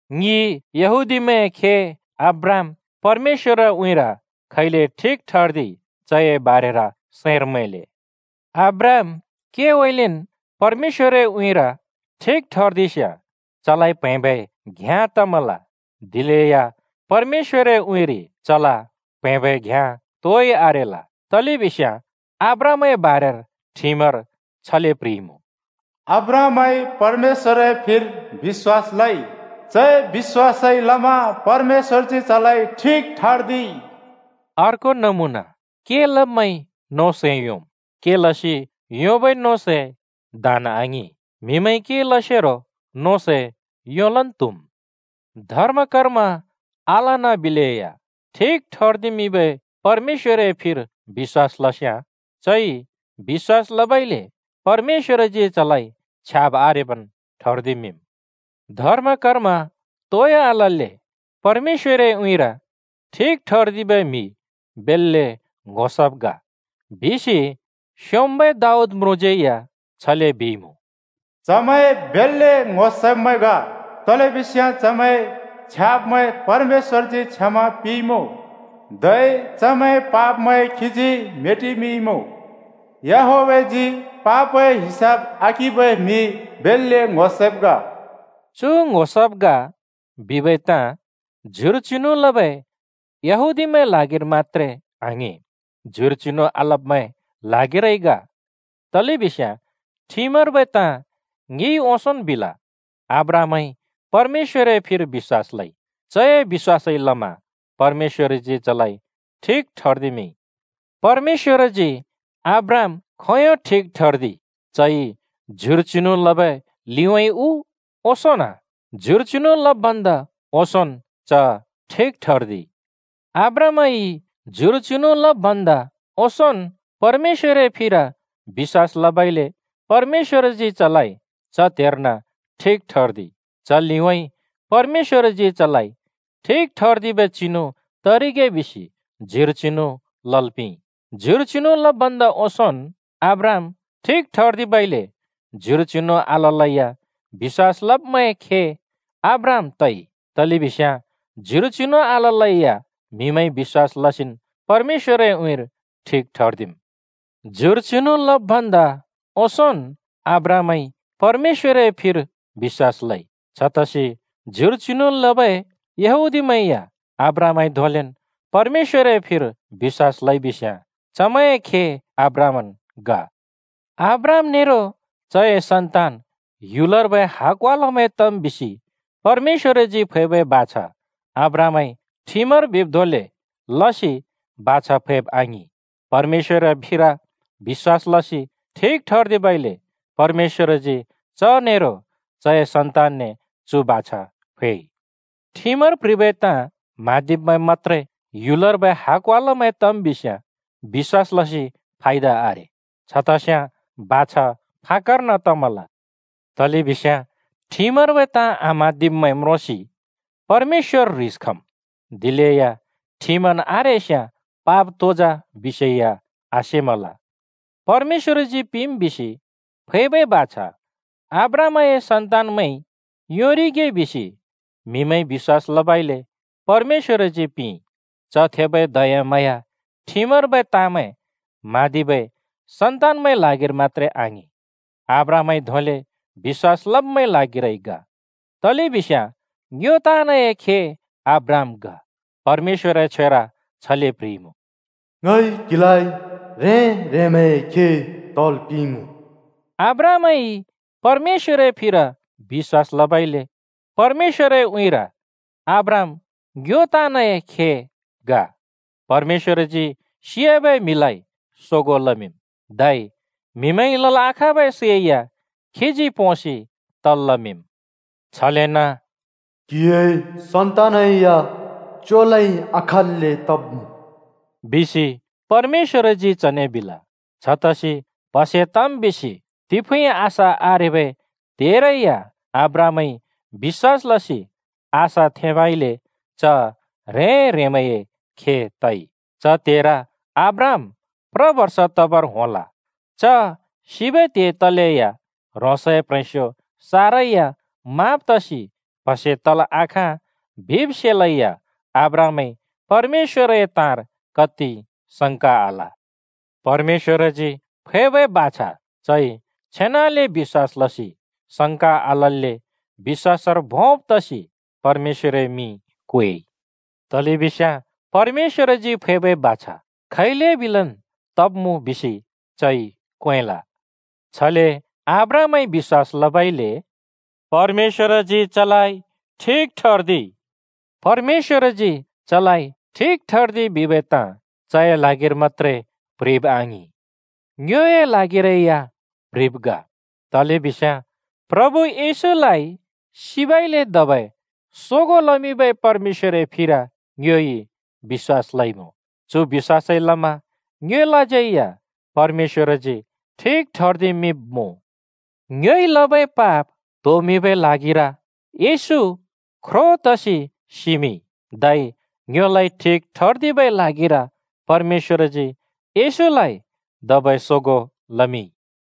ङि यहूदीमैंए खे अब्राहाम परमेश्‍वरए उँइँर खैले ठिक ठर्दिइ? चए बारेर सैंर मैंले। अब्राहाम केउँइँलेन् परमेश्‍वरए उँइँर ठिक ठर्दिस्‍याँ चलाइ प्‍हैंबै घ्‍याँ तमल, दिलेया परमेश्‍वरए उँइँरि चल प्‍हैंबै घ्याँ तोइ आरेल। तलेबिस्याँ अब्राहामए बारेर ठिमर छले प्ह्रिइमुँ: “अब्राहामइ परमेश्‍वरए फिर बिश्‍वास लइ। चए बिश्‍वासइ लमा परमेश्‍वरजी चलाइ ठिक ठर्दिइ।” अर्को नमुना: के लब्‍मैंइ नों सै योंम्, के लसि योंबै नों सै दान आङिं, म्हिमैंइ के लसेरो नों सै योंलन् त्हुम्। धर्म-कर्म आलन बिलेया ठिक ठर्दिमिंबै परमेश्‍वरए फिर बिश्‍वास लस्याँ, चइ बिश्‍वास लबइले परमेश्‍वरजी चलाइ छ्याब् आरेबन् ठर्दिमिंम्। धर्म-कर्म तोइ आलल्‍ले परमेश्‍वरए उँइँर ठिक ठर्दिबै म्‍हि बेल्‍ले ङ्‍हो सब् ग बिसि स्‍योंम्‍बै दाऊद म्रुँज्‍यै या छले बिइमुँ: “चमैं बेल्‍ले ङ्‍हो सब्मैं ग! तलेबिस्याँ चमैंए छ्याब्मैं परमेश्‍वरजी क्षमा पिंइमुँ, धै चमैंए पापमैं खीजी मेटिमिंइमुँ। याहवेहजी पापए हिसाब आकिंबै म्हि बेल्‍ले ङ्‍हो सब् ग!” चु “ङ्‍हो सब् ग” बिबै ताँ ज्युर चिनु लबै यहूदीमैंए ल्हागिर मत्‍त्रे आङिं, ज्युर चिनु आलब्‍मैंए ल्हागिरै ग। तलेबिस्याँ ठिमर्बै ताँ ङिइ ओंसोंन् बिल, “अब्राहामइ परमेश्‍वरए फिर बिश्‍वास लइ। चए बिश्‍वासइ लमा परमेश्‍वरजी चलाइ ठिक ठर्दिमिंइ।” परमेश्‍वरजी अब्राहाम खोंयों ठिक ठर्दिइ? चइ ज्युर चिनु लबै लिउँइँ उ ओंसोंन्? ज्युर चिनु लब् भन्दा ओंसोंन् च ठिक ठर्दिइ। अब्राहामइ ज्युर चिनु लब् भन्दा ओंसोंन् परमेश्‍वरए फिर बिश्‍वास लबइले परमेश्‍वरजी चलाइ च त्हेर्न ठिक ठर्दिइ। च लिउँइँ परमेश्‍वरजी चलाइ ठिक ठर्दिबै चिनु तरिगे बिसि ज्युर चिनु लल् पिंइ। ज्युर चिनु लब् भन्दा ओंसोंन् अब्राहाम ठिक ठर्दिबइले ज्युर चिनु आललैया बिश्‍वास लब्‍मैंए खे अब्राहाम तइ, तलेबिस्याँ ज्युर चिनु आललैया म्‍हिमैंइ बिश्‍वास लसिन् परमेश्‍वरए उँइँर ठिक ठर्दिम्। ज्युर चिनु लब् भन्दा ओंसोंन् अब्राहामइ परमेश्‍वरए फिर बिश्‍वास लइ। छतसि ज्युर चिनु लबै यहूदीमैं या अब्राहामइ धोंलेन् परमेश्‍वरए फिर बिश्‍वास लइबिस्‍याँ चमैंए खे अब्राहामन् ग। अब्राहाम नेरो चए सन्तान ह्‍युलर्बै हकवालामैं तम् बिसि परमेश्‍वरजी फैबै बाछा अब्राहामइ ठिमर बिब् धोंले लसि बाछा फैब् आङिं, परमेश्‍वरए फिर बिश्‍वास लसि ठिक ठर्दिबइले परमेश्‍वरजी च नेरो चए सन्‍तानने चु बाछा फैइ। ठिमर प्ह्रिबै ताँ म्हँदिब्‍मैं मत्‍त्रे ह्‍युलर्बै हाकवालमैं तम् बिस्याँ बिश्‍वास लसि फायदा आरे। छ तस्याँ बाछा फाक्‍कर्न तमल। तलेबिस्याँ ठिमर्बै ताँ आम्हाँदिब्मैं म्रोंसि परमेश्‍वर ह्रिस खम्, दिलेया ठिमन् आरेस्याँ पाप तो जा बिसेया आसेमल। परमेश्‍वरजी पिंम् बिसि फैबै बाछा अब्राहामए सन्‍तानमैंइ योंरिगे बिसि म्‍हिमैंइ बिश्‍वास लबइले परमेश्‍वरजी पिंइ। च थेबै दयाम्हाँया ठिमर्बै ताँमैं म्हाँदिबै सन्‍तानए ल्हागिर मत्‍त्रे आङिं, अब्राहामइ धोंले बिश्‍वास लब्‍मैंए ल्हागिरै ग। तलेबिस्याँ ङ्यो ताँनए खे अब्राहाम ग। परमेश्‍वरए छ्वेर छले प्ह्रिइमुँ, “ङइ क्‍हिलाइ ह्रें-ह्रेंमैंए खे तल् पिंइमुँ।” अब्राहामइ परमेश्‍वरए फिर बिश्‍वास लबइले परमेश्‍वरए उँइँर अब्राहाम ङ्यो ताँनए खे ग। परमेश्‍बरजी सियाबै म्हिलाइ सोगों लमिंम्, धै म्‍हिमैंइ लल् आखाँबै सै या खीजी पोंसि तल् लमिंम्। छलेन “क्‍हिए सन्‍तानै या च्योलै आखाँल्‍ले तब्‍मुँ” बिसि परमेश्‍वरजी चने बिल। छतसि प्हसे तम् बिसि तिफुँइ आशा आरेबै त्हेरै या अब्राहामइ बिश्‍वास लसि आशा थेंबइले च ह्रें-ह्रेंमैंए खे तइ। च त्हेर अब्राहाम प्र बर्ष तबर होंल च सिबै त्हे तयालैया, ह्रोंसए प्ह्रेंस्यो सारा या माँब् तसि प्‍हसे तल् आखाँ बिब् सेलैया अब्राहामइ परमेश्‍वरए ताँर कत्ति संका आल। परमेश्‍वरजी फैबै बाछा चइ छेनाले बिश्‍वास लसि संका आलल्‍ले बिश्‍वासर भोंब तसि परमेश्‍वरए मिं क्वेइ। तलेबिस्याँ परमेश्‍वरजी फैबै बाछा खैले बिलेन् तब्‍मुँ बिसि चइ क्वेंल। छले अब्राहामइ बिश्‍वास लबइले “परमेश्‍वरजी चलाइ ठिक ठर्दिइ।” “परमेश्‍वरजी चलाइ ठिक ठर्दिइ” बिबै ताँ चए ल्हागिर मत्‍त्रे प्‍ह्रिब् आङिं। ङ्योए ल्हागिरै या प्‍ह्रिब् ग। तलेबिस्याँ प्रभु येशूलाइ सिबइले धबै सोगों लमिंबै परमेश्‍वरए फिर ङ्योइ बिश्‍वास लइमुँ। चु बिश्‍वासइ लमा ङ्योलाज्यै या “परमेश्‍वरजी ठिक ठर्दिमिंब्‍मुँ।” ङ्योइ लबै पाप त्होमिंबै ल्हागिर येशू ख्रो तसि सिमिंइ, धै ङ्योलाइ ठिक ठर्दिबै ल्हागिर परमेश्‍वरजी येशूलाइ धबै सोगों लमिंइ।